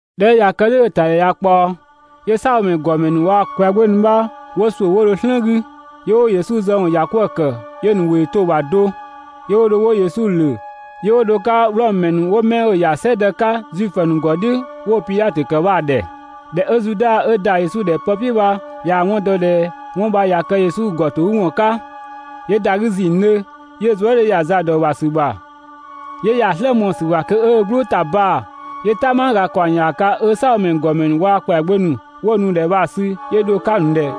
꞊Dhɛ 'ö ꞊ya kë "dhʋ̈ 'ö‑ ‑tadhɛ ꞊ya ꞊kpaɔ, 'yö "saabhomɛ ‑nu ‑gɔmɛ ‑nu waa‑ ‑kwɛagbö ‑nu bha 'wo ‑suʋ̈ 'wo dho "slën 'gü, 'yö 'wo Yesu zë ‑wɔn ‑ya 'kwëë‑ ‑kë 'yö‑ ‑nu ‑wʋ ‑yö to‑ ‑bha do. 'Yö 'wo dho 'wo Yesu ‑lö, 'yö 'wo dho‑ 'ka Wlɔmö ‑mɛ ‑nu 'wo 'mɛ 'ö‑ ‑ya "sɛdë 'ka Zuifö ‑nu ‑gɔ "dhiʋ̈ 'wo‑ Pidhatö ‑kë bha‑ ‑dhɛ. ꞊Dhɛ 'ö Zuda 'ö ‑da Yesu ‑dhɛ pë "piʋ̈ bha ꞊yaa‑ 'wɔn dɔ ꞊dhɛ 'wɔn bha ꞊ya kë Yesu ‑gɔtogüwɔn 'ka, 'yö ‑da 'gü ‑zinngdhö, 'yö‑ zuë" 'dhö ‑ya za ‑dɔ ‑bha ‑sü ‑bha, 'yö ‑ya ‑a "slë mɔɔ‑ ‑sü ‑bha kö 'ö ö "gblʋʋ ‑ta baa‑. 'Yö "tanma ‑kaɔng ‑yaaga 'ö "Saabhomɛ ‑nu ‑gɔmɛ ‑nu waa‑ ‑kwɛagbö ‑nu 'wo‑ nu‑ ‑dhɛ bha‑ sü 'yö dho‑ 'ka‑ ‑nu ‑dhɛ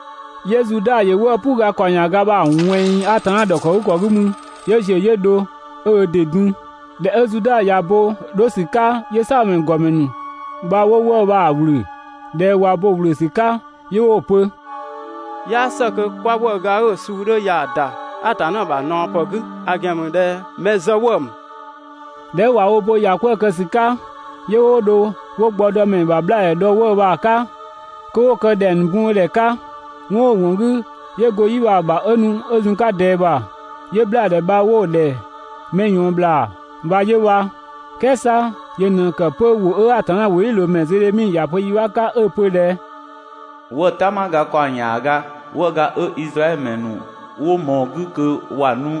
'Yö Zuda ‑yö 'wëë‑ "puu ga ‑kaɔng ‑yaaga bha‑ ꞊wɛnng Atanna ‑dhɔkëgükɔ 'gü mü, 'yö ‑ziö 'yö dho 'yö ö ‑dɩ dun. ꞊Dhɛ 'ö Zuda ꞊ya bo 'dho ‑sü 'ka, 'yö "saabhomɛ ‑nu ‑gɔmɛ ‑nu bha 'wo 'wëë‑ bha‑ ‑wlö. ꞊Dhɛ 'ö ꞊wa wo bo‑ ‑wlö ‑sü 'ka 'yö 'wo‑ pö: «'Yaa ‑së kö 'kwa 'wëëga 'ö‑ suu 'dhö ya ‑da Atanna ‑bha ꞊naɔ ‑pë 'gü, ‑a ‑gɛn ‑mü ꞊dhɛ mɛ zë 'wëë‑ ‑mü. ꞊Dhɛ 'ö ꞊wa wo bo‑ ‑ya 'kwëë‑ kë ‑sü 'ka, 'yö 'wo dho 'wo gbɔdɔmɛ ‑bha 'bhlaa‑ dhɔ‑ 'wëë‑ bha‑ 'ka kö 'wo ‑dhɛ kë ‑dhɛng ‑nu bun bho ‑dhɛ 'ka. 'Wɔn 'ö‑ ‑wɔn 'gü 'yö go‑ 'yi bha‑ ‑bha 'ö nu 'ö zun‑ 'ka ꞊dɛɛ ‑bha, 'yö 'wo‑ 'bhlaadhɛ bha‑ ‑dhɛ ‹mɛ ꞊yɔɔn sɔɔn ‑bhlaa› bha 'yö bha. "Kɛɛ 'sa yö ꞊në ‑kë 'pö ‑wʋ 'ö Atanna ‑wʋdhiʋ̈loomɛ Zedhemi ‑ya pö yi 'bha 'ka 'ö‑ pö ꞊dhɛ: ‹'Wëë‑ "tanmaga ‑kaɔng ‑yaaga, 'wëëga 'ö Izraɛdhö ‑mɛ ‑nu 'wo ꞊mɔɔ‑ 'gü kö ‑wa nu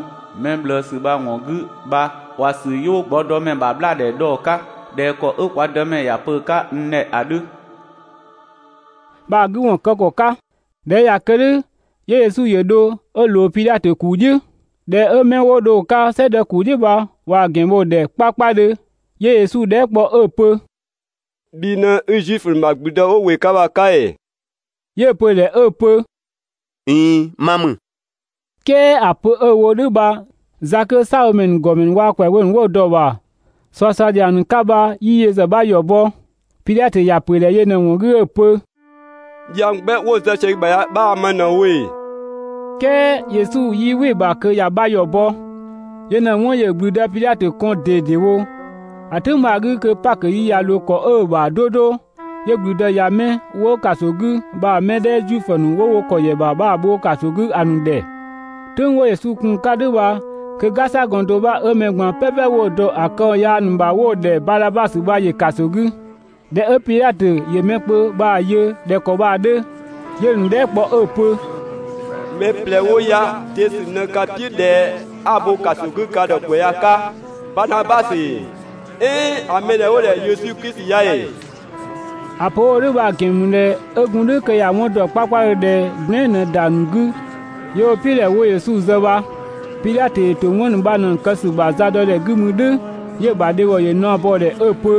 mɛ ꞊bhlëësü bha‑ ‑wɔn 'gü bha ‑wa ‑sü 'yö 'wo gbɔdɔmɛ ‑bha 'bhlaadhɛ dhɔ‑ 'ka ꞊dhɛ ‑kɔ 'ö kwa Dëmɛ ‑ya pö‑ 'ka n ‑dhɛ ‑a 'dhö› bha‑ 'gü ‑wɔn kë ‑kɔ 'ka.» ꞊Dhɛ 'ö ꞊ya kë "dhʋ̈, 'yö Yesu ‑yö dho 'ö ꞊loo Pidhatö ‑kuu "dhiʋ̈. ꞊Dhɛ 'ö 'mɛ 'wo dho‑ 'ka "sɛdë ‑kuu "dhiʋ̈ bha ꞊waa‑ ‑gɛn bho‑ ‑dhɛ 'kpakpadhö, 'yö Yesu dhɛɛ" kpɔ 'ö‑ pö: «Bhi ꞊në 'i Zuifö ‑nu ‑bha ‑gblüdë 'wo ‑wɩ 'ka bha‑ 'ka ‑ee?» 'Yö‑ pö‑ ‑dhɛ 'ö‑ pö: «꞊Iin, ma ‑mü.» "Kɛɛ ‑a pö 'ö‑ wo "dhʋ̈ bha za 'kö "saabhomɛ ‑nu ‑gɔmɛ ‑nu waa‑ ‑kwɛagbö ‑nu 'wo dɔ‑ ‑bha ꞊suasua ‑dhiang ‑nu 'ka bha 'yii yö ‑zë 'bha ‑yɔ bɔ. Pidhatö ‑ya ‑pö ‑dhɛ yö ꞊në‑ ‑wɔn 'gü 'ö‑ pö: «Dhiang 'gbɛ 'wo‑ zë sië i bha ya 'bhaa‑ ma ꞊në‑ wo ‑ee?» "Kɛɛ Yesu 'yii‑ "wɩ‑ ‑bha kö ‑ya 'bha ‑yɔ bɔ, yö ꞊në‑ 'wɔn ‑yö ‑gblüdë Pidhatö kɔn ꞊dedewo. ‑A "tʋ̈ng bha‑ 'gü kö Pakö yi ꞊ya ꞊loo ‑kɔ 'ö‑ ‑bha 'do 'do, 'yö ‑gblüdë ꞊ya 'mɛ 'wo ‑kaso 'gü bha‑ mɛ 'dhɛ Zuifö ‑nu ‑wo wo ‑kɔ ‑yɛ ‑bha bha‑ bho ‑kaso 'gü ‑a ‑nu ‑dhɛ. "Tʋ̈ng 'wo Yesu kun‑ 'ka "dhʋ̈ bha, kö "gasagɔn do 'bha 'ö mɛ ꞊gban "pɛpɛ 'wo‑ dɔ ‑a këwɔn yaa ‑nu ‑bha 'wo‑ ‑dhɛ Badhabasö bha ‑yö ‑kaso 'gü. ꞊Dhɛ 'ö Pidhatö ‑yö mɛ kpö bha‑ yö ꞊dhɛ ‑kɔ bha‑ 'dhö, 'yö‑ ‑nu dhɛɛ" kpɔ 'ö‑ pö: «Mɛ ꞊plɛ 'wo ya‑ de ‑sü ꞊në 'ka‑ "piʋ̈ ꞊dhɛ 'a‑ bho ‑kaso 'gü ka ‑dhɛ ‑kwɛ ya‑ 'ka? Badhabasö ‑ee? "Ɛɛn ‑a mɛ 'dhɛ 'wo‑ ‑dhɛ Yesu Klisi ya ‑ee?» ‑A pö 'ö‑ wo "dhʋ̈ bha‑ ‑gɛn ‑mü ꞊dhɛ 'ö gun "dhʋ̈ kö ‑ya 'wɔn ‑dɔ 'kpakpadhö ꞊dhɛ gblɛɛn" ꞊në ‑da ‑nu 'gü 'yö 'wo‑ "piʋ̈ ꞊dhɛ 'wo Yesu zë bha. Pidhatö ‑yö ‑to 'wɔn ‑nu bha ꞊në‑ ‑nu kë ‑sü ‑bha zadɔdhɛ 'gü mü "dhʋ̈, 'yö‑ ‑bha dhebhɔ ‑yö naɔ bɔ‑ ‑dhɛ 'ö‑ pö: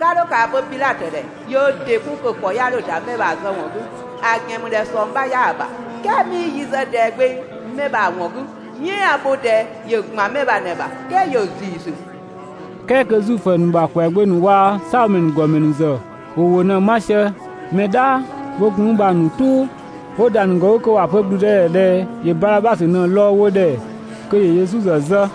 «'Ka 'dho ‑kaa pö Pidhatö ‑dhɛ ‑yö ö ‑dɩ 'kun kö‑ ‑kɔ ꞊ya 'dho ‑da 'mɛ bha‑ zë ‑wɔn 'gü, ‑a ‑gɛn ‑mü ꞊dhɛ ꞊sɔng 'bha 'yaa‑ ‑bha. "Kɛɛ 'mii yi zë ꞊dɛɛ gbeng 'mɛ bha‑ ‑wɔn 'gü, "yɛɛn 'a‑ bho ꞊dɛɛ ‑yö ‑gban 'mɛ bha ꞊në‑ ‑bha, "kɛɛ ‑yö ‑ziisü.» "Kɛɛ kö Zuifö ‑nu ‑bha ‑kwɛagbö ‑nu waa‑ "saabhomɛ ‑nu ‑gɔmɛ ‑nu ‑zë ‑wo ‑wʋ ꞊në‑ 'ma sië mɛ "dhaa 'wo gun mü bha‑ ‑nu "tʋʋ, 'wo ‑da ‑nu ‑gɔ 'gü kö ‑wa pö ‑gblüdëdhɛ ꞊dhɛ ‑yö Badhabasö ꞊në‑ lɔɔ‑ wo ‑dhɛ kö ‑yö Yesu ‑zë zë.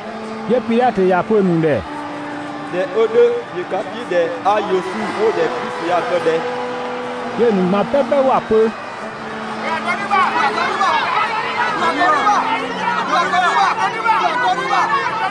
'Yö Pidhatö ‑ya pö‑ ‑nu ‑dhɛ: «꞊Dhɛ 'ö "dhʋ̈ ‑yö ka "piʋ̈ ꞊dhɛ 'a Yesu 'wo‑ ‑dhɛ Klisi ya‑ kë ꞊dhɛ?» 'Yö‑ ‑nu ꞊gban "pɛpɛ ‑wa pö: «‑Bhö ‑a dɔ "dhü ‑bha! (‑Bhö ‑a dɔ "dhü ‑bha!)»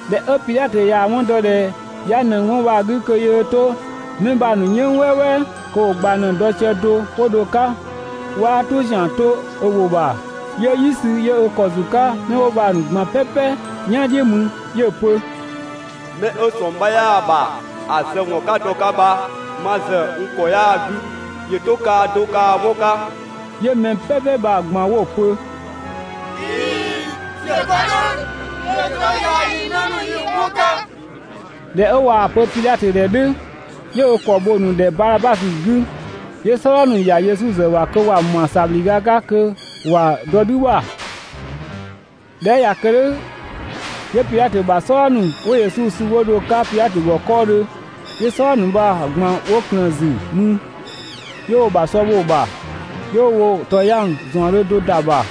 ꞊Dhɛ 'ö Pidhatö ꞊yaa‑ 'wɔn dɔ ꞊dhɛ 'ya ꞊nëng 'wɔn bha‑ 'gü kö yöö 'to 'mɛ bha‑ ‑nu "yënng "wɛɛwɛɛ, kö ‑wo ꞊gbang ꞊në‑ dɔ sië do 'wo dho‑ 'ka 'waa "tʋ ‑zian ‑dɔ ö ‑wʋ ‑bha, 'yö "yi sü, 'yö ö ‑kɔ ‑zu 'ka 'mɛ 'wo bha‑ ꞊gban "pɛpɛ "yan "dhiʋ̈ mü 'yö‑ pö: «'Mɛ 'ö ꞊sɔng 'bha 'yaa‑ ‑bha ‑a zë ‑wɔn 'ka dɔ‑ 'ka bha ma ‑zë n ‑kɔ 'yaa‑ 'gü, ‑yö 'to kaa do kaa 'wɔn 'ka. 'Yö mɛ "pɛpɛ bha‑ ꞊gban 'wo‑ pö: «꞊Iin, ‑yö kë "dhʋ̈, ‑yö 'to yaa yii‑ 'në ‑nu yii‑ 'wɔn 'ka!» ꞊Dhɛ 'ö ꞊waa‑ pö Pidhatö ‑dhɛ "dhʋ̈, 'yö ö ‑kɔ bho‑ ‑nu ‑dhɛ Badhabasö 'gü. 'Yö "sɔdha ‑nu ‑ya Yesu ‑zë ‑bha kö ‑wa ‑ma ‑sabhlüga 'ka kö ‑wa dɔ "dhü bha. ꞊Dhɛ 'ö ꞊ya kë "dhʋ̈, 'yö Pidhatö ‑bha "sɔdha ‑nu 'wo Yesu sü 'wo dho‑ 'ka Pidhatö ‑gɔ 'kɔɔdhö, 'yö "sɔdha ‑nu bha‑ ꞊gban 'wo ꞊klëën‑ ‑zü mü. 'Yö 'wo‑ ‑bha sɔ bho‑ ‑bha, 'yö 'wo ‑tɔyang ‑zaɔndhö do ‑da ‑bha,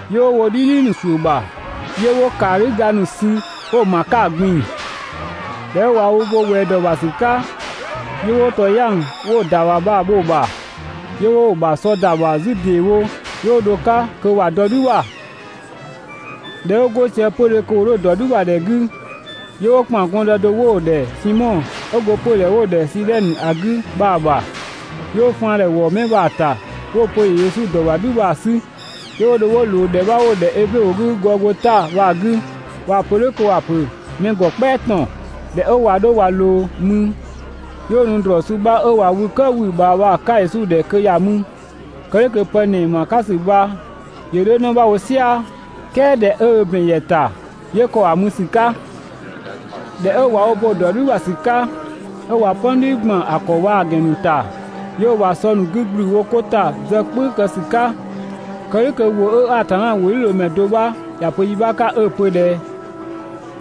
'Yö 'wo wo "dhidhi ‑nu ‑suʋ̈ ‑bha, 'yö 'wo ‑kaadhüga ‑nu sü 'wo‑ ‑ma 'ka‑ ꞊gbin‑. ꞊Dhɛ 'ö ꞊wa wo bo ꞊wɛɛ ‑dɔ ‑bha ‑sü 'ka, 'yö 'wo ‑tɔyang 'wo‑ ‑da ‑bha bha‑ bho‑ ‑bha, 'yö 'wo‑ ‑bha sɔ ‑da ‑bha 'zü ‑deewo 'yö 'wo dho‑ 'ka kö ‑wa dɔ "dhü ‑bha. ꞊Dhɛ 'wo 'go sië 'pödhö kö ‑wo 'dho‑ ‑dɔ "dhü ‑bha ‑dhɛ 'gü, 'yö 'wo ‑kpan gɔndë do 'wo‑ ‑dhɛ Simɔ, 'ö go 'pödhɛ 'wo‑ ‑dhɛ Sidhɛnö ‑a 'gü bha‑ ‑bha. 'Yö 'wo faandhɛ ‑wɔ 'mɛ bha‑ ‑ta 'wo‑ pö ‑yö Yesu ‑dɔ ‑bha "dhü bha‑ 'sü 'Yö 'wo dho 'wo ꞊loo ‑dhɛ 'bha 'wo‑ ‑dhɛ eblö ‑wʋ 'gü Gɔgota bha‑ 'gü (꞊waa‑ pö "dhʋ̈ kö ‑wa ‑pö ‹mɛ ‑gɔ "kpɛa ‑tɔn›). ꞊Dhɛ 'ö ꞊wa 'dho ꞊wa ꞊loo mü, 'yö 'wo nu ‑drɔɔ suu 'bha 'ö ꞊wa wü "këë wü‑ ꞊bhaa bha‑ 'ka Yesu ‑dhɛ kö ‑ya mü (kë "dhʋ̈ kö pë ‑nɛɛ ‑ma 'ka ‑sü bha ‑yö 'dho 'në 'bha wo "sia‑). "Kɛɛ ꞊dhɛ 'ö ö ‑bɛn ‑ya ‑ta, 'yö ‑kɔ ‑a mü ‑sü 'ka. ꞊Dhɛ 'ö ꞊wa wo bo‑ ‑dɔ "dhü ‑bha ‑sü 'ka, 'ö ꞊wa "pɔni ‑gban ‑a ‑kɔ waa‑ ‑gɛn ‑nu ‑ta, 'yö 'wo‑ ‑bha sɔ ‑nu 'gü ‑gblü wo 'ko ‑ta zë "kpʋ̈ü kë ‑sü 'ka [kë "dhʋ̈ kö ‑wʋ 'ö Atanna ‑wʋdhiʋ̈loomɛ do 'bha ‑ya pö yi 'bha 'ka 'ö‑ pö ꞊dhɛ: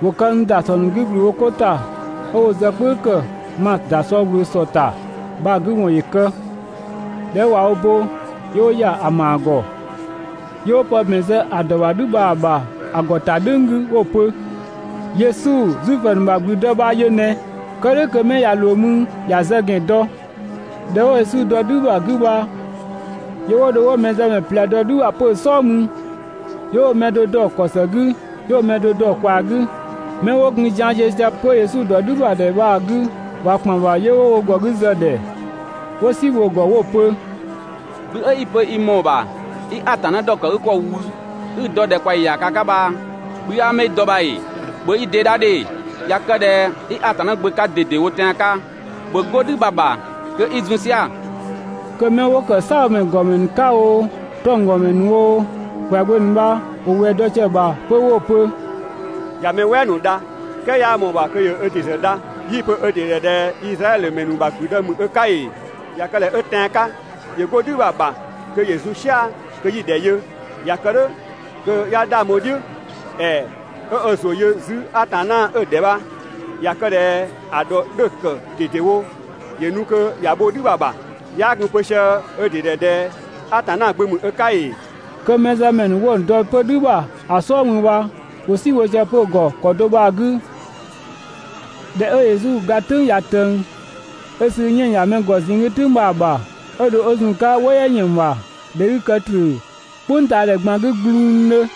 «‑Wo kë n ‑dasɔ ‑nu 'gü ‑gblü wo 'ko ‑ta, 'ö 'wo zë "kpʋ̈ü ‑kë ma ‑da sɔ ꞊wlöö ‑sɔ ‑ta» bha‑ 'gü ‑wɔn ‑yö kë]. ꞊Dhɛ 'ö ꞊wa wo bo, 'yö 'wo ‑ya ‑a ‑maa ‑gɔ. 'Yö 'wo pë ‑bɛn zë ‑a ‑dɔ ‑bha "dhü bha‑ ‑bha ‑a ‑gɔ ‑ta "dhʋ̈ng 'gü 'wo‑ pö: «Yesu, Zuifö ‑nu ‑bha ‑gblüdë bha yö ꞊nɛ!» Kë "dhʋ̈ kö 'mɛ ꞊ya ꞊loo mü ‑ya zë ‑gɛn dɔ. ‑Dhɛ 'wo Yesu dɔ "dhü ‑bha 'gü bha, 'yö 'wo dho 'wo mɛzëmɛ ꞊plɛ dɔ "dhü ‑bha 'pö‑ "sɔɔ mü. 'Yö 'wo mɛ do dɔ‑ ‑kɔ ‑së 'gü, 'yö 'wo mɛ do dɔ‑ ꞊kwaa 'gü. 'Mɛ 'wo gun zian ziö sië 'pö Yesu ‑dɔ "dhü ‑bha ‑dhɛ bha‑ 'gü, ꞊wa ‑kpan ‑bha 'yö 'wo wo ‑gɔ 'gü zë‑ ‑dhɛ, 'wo "si bho‑ ‑gɔ 'wo‑ pö: «Bhi 'ö 'i‑ pö i ‑mɔɔ ‑bha 'i Atanna ‑dhɔkëgükɔ wü 'i‑ dɔ ‑dhɛkpaɔyi ‑yaaga 'ka bha, bhi 'aa mü i dɔ bha ‑ee? ‑Bhö i ‑dɩ dha ‑dhe! ꞊Ya kë ꞊dhɛ 'i Atanna Gbö 'ka ꞊dedewo tɛan‑ 'ka, ‑bhö 'go "dhü bha‑ ‑bha kö 'i zun "sia‑!» Kö 'mɛ 'wo ‑kë "saabhomɛ ‑nu ‑gɔmɛ ‑nu 'ka oo, 'tɔnggɔmɛ ‑nu oo, ‑kwɛagbö ‑nu bha ‑wo ꞊wɛɛ dɔ sië‑ ‑bha 'pö 'wo‑ pö: «꞊Ya mɛ "wɛɛ ‑nu dha "kɛɛ 'yaa ꞊mɔɔ‑ ‑bha kö ‑yö ö ‑dɩ ‑zë dha! 'Yii‑ pö ö ‑dɩ ‑dhɛ Izraɛdhö ‑mɛ ‑nu ‑bha ‑gblüdë ‑mü ö 'ka ‑ee? ꞊Ya kë ꞊dhɛ 'ö "dhʋ̈ tɛan‑ 'ka, ‑yö 'go "dhü bha‑ ‑bha kö ‑yö zun "sia‑ kö 'yi‑ ‑dhɛ yö, ꞊ya kë "dhʋ̈ kö 'ya 'dhang bho‑ "dhiʋ̈! ‑Ɛɛ, 'ö ö ‑zʋ yö 'zü Atanna 'ö‑ ‑dhɛ bha, ꞊ya kë ꞊dhɛ ‑a ‑dhɔ 'dhö‑ ‑kë ꞊dedewo, ‑yö nu kö ‑ya bho "dhü bha‑ ‑bha! 'Yaa gun‑ pö sië ö ‑dɩ ‑dhɛ ꞊dhɛ Atanna Gbö ‑mü ö 'ka ‑ee?» Kö mɛzëmɛ ‑nu 'wo‑ ‑nu dɔ 'pö "dhü ‑bha ‑a "sɔɔ mü bha, ‑wo "si bho sië‑ ‑gɔ 'pö ‑kɔ do bha‑ 'gü. (꞊Dhɛ 'ö Yesu ga "tʋ̈ng ꞊ya ꞊tëng) 'ö sü 'yënng‑ ‑ya mɛ ‑gɔ ꞊zinng 'gü "tʋ̈ng bha‑ ‑bha, 'ö dho 'ö zun‑ 'ka "wɔ "yɛ ‑yën ‑bha, ‑dhɛ 'gü‑ kë ‑tröö "kpʋngtaadhɛ ꞊gban 'gü gbluungdhö.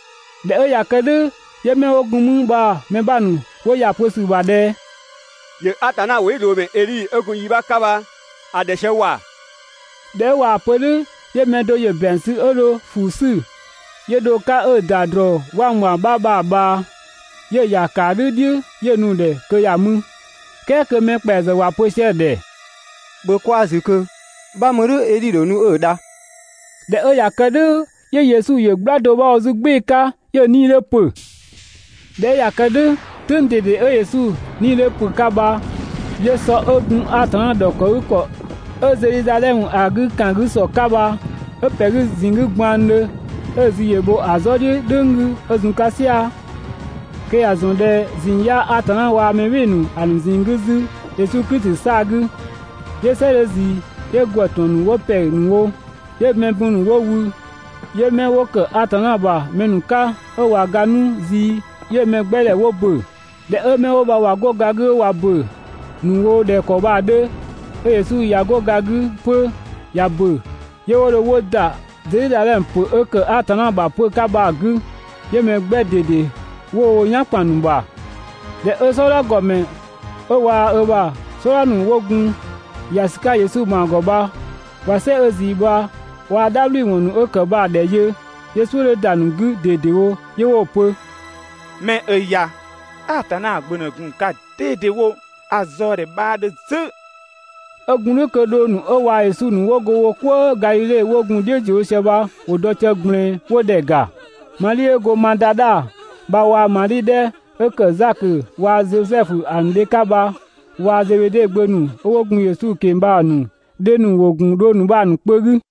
꞊Dhɛ 'ö ꞊ya kë "dhʋ̈, 'yö 'mɛ 'wo gun mü bha‑ mɛ 'bha ‑nu 'wo ‑ya pö ‑sü ‑bha ꞊dhɛ: «‑Yö (Atanna ‑wʋdhiʋ̈loomɛ Edhi 'ö gun yi 'bha 'ka bha‑) ‑dhɛ sië ‑wa!» ꞊Dhɛ 'ö ꞊waa‑ pö "dhʋ̈, 'yö mɛ do ‑yö ‑bɛang sü 'ö dho ‑fuu 'sü, 'yö dho‑ 'ka 'ö‑ ‑da ‑drɔɔ 'wangwang 'bha bha‑ ꞊bhaa, 'yö‑ ‑ya ‑kaadhü "dhiʋ̈ 'yö‑ nu‑ ‑dhɛ kö ‑ya mü. "Kɛɛ kö mɛ ‑kpɛa ‑zë ‑wa pö sië‑ ‑dhɛ: «‑Bhö kwaa‑ ‑zü ꞊kö, 'bha mü "dhʋ̈ Edhi ‑dho nu 'ö‑ dha.» ꞊Dhɛ 'ö ꞊ya kë "dhʋ̈ 'yö Yesu ‑yö "gbla do 'bha wo 'zü "gbɩɩ‑ 'ka, 'yö‑ 'nii‑ 'dhö ‑pö. ꞊Dhɛ 'ö ꞊ya kë "dhʋ̈, "tʋ̈ng ꞊dede 'ö Yesu 'nii‑ 'dhö ‑pö 'ka bha 'yö sɔ 'ö gun Atanna ‑dhɔkëgükɔ 'ö Zedhizadhɛmö ‑a 'gü ‑kan 'gü ‑sɔ 'ka bha, 'ö ‑pɛ 'gü ꞊zinng 'gü gbanngdhö 'ö‑ zü ‑yö bho ‑a "zɔ "dhiʋ̈ "dhʋ̈ng 'gü 'ö zun‑ 'ka "sia‑ (kö ‑ya ‑zɔn ꞊dhɛ ꞊zinng 'yaa Atanna waa‑ mɛ "bhɩɩ‑ ‑nu ‑a ‑nu ꞊zinng 'gü 'zü Yesu Klisi 'saa‑ 'gü). 'Yö "sɛ 'dhö ꞊zii 'yö ‑gwë ‑tɔn ‑nu 'wo ‑pɛ ‑nu wo. 'Yö mɛ bun ‑nu 'wo wü, 'yö 'mɛ 'wo ‑kë Atanna ‑bha mɛ ‑nu 'ka 'ö ꞊wa ga 'nu zii, 'yö‑ mɛ 'gbɛ 'wo ‑bö. ꞊Dhɛ 'ö 'mɛ 'wo bha ‑wa 'go ga 'gü, 'ö ꞊wa ‑bö ‑nu wo ꞊dhɛ ‑kɔ bha‑ 'dhö, 'ö Yesu ꞊ya 'go ga 'gü 'pö ꞊ya ‑bö, 'yö 'wo dho 'wo ‑da Zedhizadhɛmö ‑pö 'ö ‑kë Atanna ‑bha 'pö‑ 'ka bha‑ 'gü, 'yö mɛ 'gbɛ ꞊dede 'wo wo "yan ‑kpan ‑nu ‑bha. ꞊Dhɛ 'ö "sɔdha ‑gɔmɛ 'ö waa‑ ö ‑bha "sɔdha ‑nu 'wo gun ‑ya ‑sü 'ka Yesu ‑maa ‑gɔ bha ꞊wa "sɛ 'ö ꞊zii bha waa‑ "dhabhliwɔn ‑nu 'ö ‑kë bha‑ ‑dhɛ yö, 'yö "suʋ̈ 'dhö ‑da ‑nu 'gü ꞊dedewo 'yö 'wo‑ pö: «'Mɛ 'ö ya Atanna Gbö ꞊në gun‑ 'ka ꞊dedewo, ‑a zaɔ ‑dhɛ 'bhaa 'dhö 'zü.» 'Ö gun "dhʋ̈ kö dhong ‑nu 'ö waa‑ Yesu ‑nu 'wo go wo "kwëë Gadhidhe 'wo gun‑ "dhiʋ̈ ‑ziö wo sië bha ‑wo dɔ sië ꞊gblɛɛn 'wo‑ ‑dhɛ ‑ga. Madhi 'ö go Madadha bha waa‑ Madhi 'dhɛ 'ö ‑kë Zakö waa‑ Zosɛfu ‑a ‑nu dhe 'ka bha, waa‑ Zebede gbö ‑nu 'ö 'wo gun Yesu ꞊keng‑ bha‑ ‑nu dhe ‑nu ‑wo ‑gun dhong ‑nu bha‑ ‑nu kpö 'gü.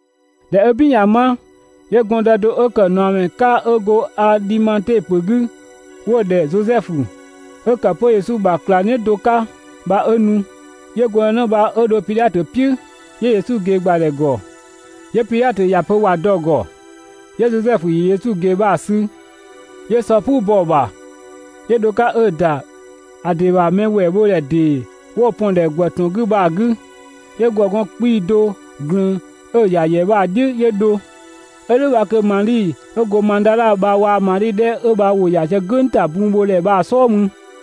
꞊Dhɛ 'ö "bin ꞊ya 'ma, 'yö gɔndë do 'ö ‑kë ꞊naɔmɛ 'ka 'ö go Adhimate ‑pö 'gü 'wo‑ ‑dhɛ Zosɛfu, 'ö ‑kë 'pö Yesu bha ꞊klangdhiʋ̈ do 'ka bha 'ö nu. 'Yö gɔndënë bha 'ö dho Pidhatö "piʋ̈ 'yö Yesu ꞊gee ‑gbadhɛ ‑gɔ. 'Yö Pidhatö ‑ya pö ‑wa dɔ‑ ‑gɔ, 'yö Zosɛfu ‑yö Yesu ꞊gee bha‑ sü 'yö sɔ "puu bɔ‑ ‑bha 'yö dho‑ 'ka 'ö‑ ‑da ‑a ‑dɩ ‑bha mɛ ‑wɛɛ bho ‑dhɛ ‑dee 'wo‑ pɔn‑ ‑dhɛ ‑gwë ‑tɔn 'gü bha‑ 'gü, 'yö ‑gwë gɔn 'kpii‑ do ꞊glün 'ö‑ ‑ya ‑yɛ bha‑ "dhiʋ̈ 'yö dho. 'Ö "dhʋ̈ bha kö Madhi 'ö go Madadha bha waa‑ Madhi 'dhɛ 'ö bha ‑wo ‑ya sië "gʋ̈ng ‑ta bunbhodhɛ bha‑ "sɔɔ mü.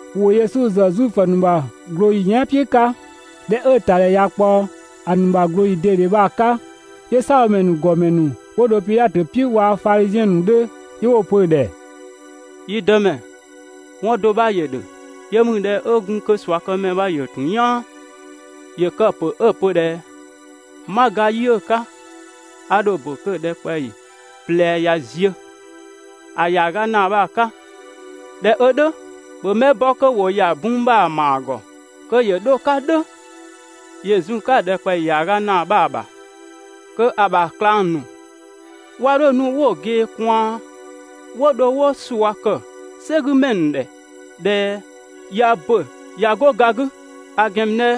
(‑Wo Yesu ‑zë Zuifö ‑nu ‑bha ꞊glooyi yɛan" "piʋ̈ 'ka.) ꞊Dhɛ 'ö‑ ‑tadhɛ ꞊ya ꞊kpaɔ ‑a ‑nu ꞊glooyi ꞊dede bha‑ 'ka, 'yö "saabhomɛ ‑nu ‑gɔmɛ ‑nu 'wo dho Pidhatö "piʋ̈ waa‑ Fadhiziɛn ‑nu 'dhö 'yö 'wo‑ pö‑ ‑dhɛ: «Yi dëmɛ, 'wɔn do 'bha ‑yö ‑dhö. Yö ‑mü ꞊dhɛ 'ö gun kö ꞊suakëmɛ bha ‑yö ‑tun "yaan, ‑yö kë‑ ‑pö 'ö‑ pö ꞊dhɛ: «'Ma ga yi 'ö‑ 'ka, a ‑dho ‑bö kö ‑dhɛkpaɔyi ꞊plɛ ꞊ya ziö, ‑a ‑yaaga ‑naa bha‑ 'ka. ꞊Dhɛ 'ö "dhʋ̈, ‑bhö mɛ bɔ kö ‑wo ‑ya bun bha‑ ‑maa ‑gɔ kö ‑yö 'dho‑ 'ka "dhʋ̈ ‑yö zun‑ 'ka‑ ‑dhɛkpaɔyi ‑yaaga ‑naa bha‑ ‑bha kö ‑a ‑bha ꞊klang ‑nu 'wa 'dho nu 'wo‑ ꞊gee ꞊kwaan 'wo dho 'wo ꞊sua ‑kë "sɛgümɛ ‑nu ‑dhɛ ꞊dhɛ ꞊ya ‑bö ꞊ya 'go ga 'gü, ‑a ‑gɛn ‑mü ꞊dhɛ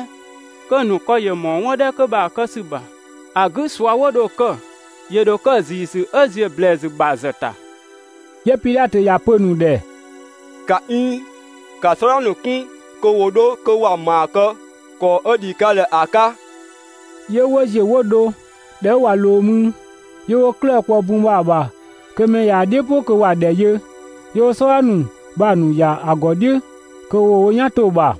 kö‑ ‑nu ‑kɔ ‑yö ‑mɔɔ 'wɔn 'dhɛ 'kö bha‑ kë ‑sü ‑bha, ‑a 'gü ꞊sua 'wo dho‑ kë ‑yö ‑dho kë ‑ziisü 'ö ‑ziö ‑blɛɛsü ‑bha ‑zë ‑ta. 'Yö Pidhatö ‑ya pö‑ ‑nu ‑dhɛ: «‑Ka 'iin, ‑ka "sɔdha ‑nu 'kun kö ‑wo 'dho kö ‑wa ‑maa kë ‑kɔ 'ö ‑dhi ka ‑dhɛ ‑a 'ka.» 'Yö 'wo ‑ziö 'wo dho. ꞊Dhɛ 'ö ꞊wa ꞊loo mü, 'yö 'wo 'klëë‑ kpɔ‑ bun bha‑ ‑bha kö mɛ ꞊yaa‑ "dhiʋ̈ "pʋ kö ‑wa ‑dhɛ yö, 'yö 'wo "sɔdha ‑nu bha‑ ‑nu ‑ya ‑a ‑gɔ "dhiʋ̈ kö ‑wo wo "yan 'to‑ ‑bha.